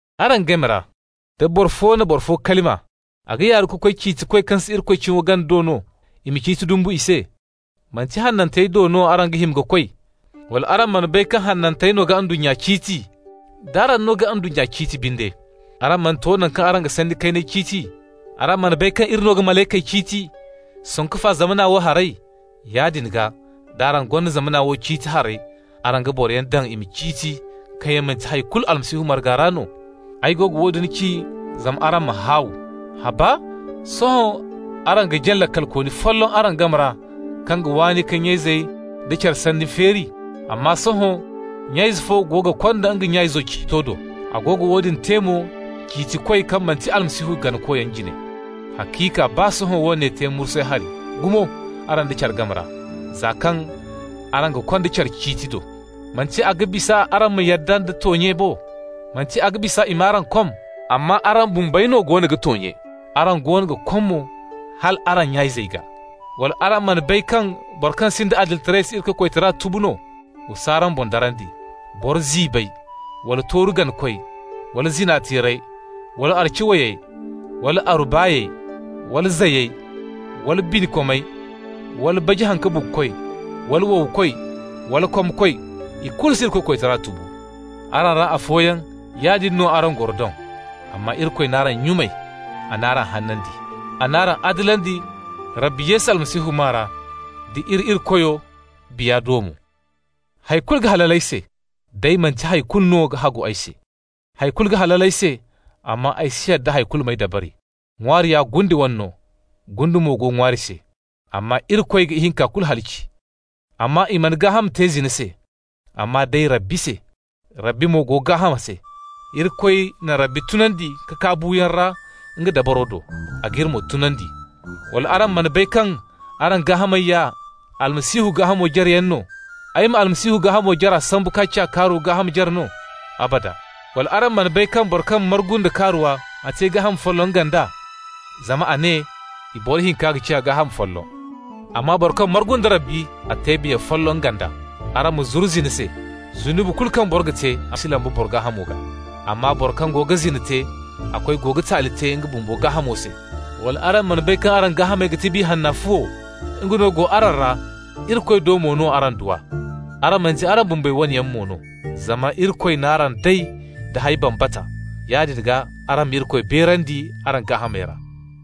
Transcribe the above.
Araŋ game ra, da boro fo na boro fo kalima, a ga yaaru ka koy ciitikoy kaŋ si Irikoy cimo gana do no, i ma ciiti dumbu i se? Manti hanantey do no araŋ ga hima ka koy? Wala araŋ mana bay kaŋ hanantey no ga ndunnya ciiti? D'araŋ no ga ndunnya ciiti binde, araŋ mana to naŋ kaŋ araŋ ga sanni kayney ciiti? Araŋ mana bay kaŋ iri no ga malaykey ciiti, sanku fa zamana wo harey? Yaadin gaa, d'araŋ gonda zamana wo ciiti harey, araŋ ga boroyaŋ daŋ i ma ciiti, kaŋ yaŋ manti hay kulu Almasihu marga ra no? Ay go ga woodin ci zama araŋ ma haaw! Haba? Sohõ araŋ ga jaŋ laakalkooni folloŋ araŋ game ra kaŋ ga waani ka nya-izey da care sanni feeri? Amma sohõ nya-ize fo go ga konda nga nya-izo ciito do. A go ga woodin te mo ciitikoy kaŋ manti Almasihu ganakoy jine! Haciika, baa sohõ woone te mursay hari gumo araŋ da care game ra, za kaŋ araŋ ga konda care ciiti do. Manti a ga bisa araŋ ma yadda nda toonye bo? Manti a ga bisa i m'araŋ kom? Amma araŋ bumbey no goono ga toonye, araŋ goono ga kom mo, hal araŋ nya-izey gaa. Wala araŋ mana bay kaŋ bora kaŋ sinda adilitaray si Irikoy koytara tubu no? Wa s'araŋ boŋ darandi! Boro ziibey, wala tooru ganakoy, wala zina-teerey, wala aru-ci-way, wala aru-baay, wala zayey, wala binikomey, wala baji-haŋ-ka-bugukoy, wala wowkoy, wala komkoy, ikulu si Irikoy koytara tubu. Araŋ ra afooyaŋ, yaadin no araŋ goro doŋ. Amma Irikoy n'araŋ nyumay, a n'araŋ hanandi, a n'araŋ adilandi Rabbi Yesu Almasihu maa ra d'iri Irikoyo Biya do mo. Hay kulu ga halal ay se, day manti hay kulu no ga hagu ay se. Hay kulu ga halal ay se, amma ay si yadda hay kulu m'ay dabari. }waari ya gunde wane no, gunde mo go ŋwaari se, amma Irikoy ga ihinka kulu halaci. Amma i mana gaaham te zina se, amma day Rabbi se. Rabbi mo go gaaham se. Irikoy na Rabbi tunandi ka kaa buuyaŋ ra nga dabaro do, a g'iri mo tunandi. Wala araŋ mana bay kaŋ araŋ gaahamey ya Almasihu gaahamo jareyaŋ no? Ay ma Almasihu gaahamo jara sambu k'a ciya kaaruwa gaaham jare no? Abada! Wala araŋ mana bay kaŋ boro kaŋ margu nda kaaruwa, a te gaaham folloŋ nga nd'a? Zama a ne: «I boro hinka ga ciya gaaham folloŋ». Amma boro kaŋ margu nda Rabbi, a te biya folloŋ nga nd'a. Araŋ ma zuru zina se! Zunubi kulu kaŋ boro ga te, a si lamba boro gaahamo gaa. Amma boro kaŋ go ga zina te, a koy go ga taali te nga bumbo gaahamo se. Wala araŋ mana bay kaŋ araŋ gaahamey ga ti Biya Hanna fuwo? Nga no go araŋ ra, Irikoy do mo no araŋ du a. Araŋ manti araŋ bumbey wane yaŋ mo no zama Irikoy n'araŋ day da hay bambata. Yaadin gaa araŋ ma Irikoy beerandi araŋ gaahamey ra.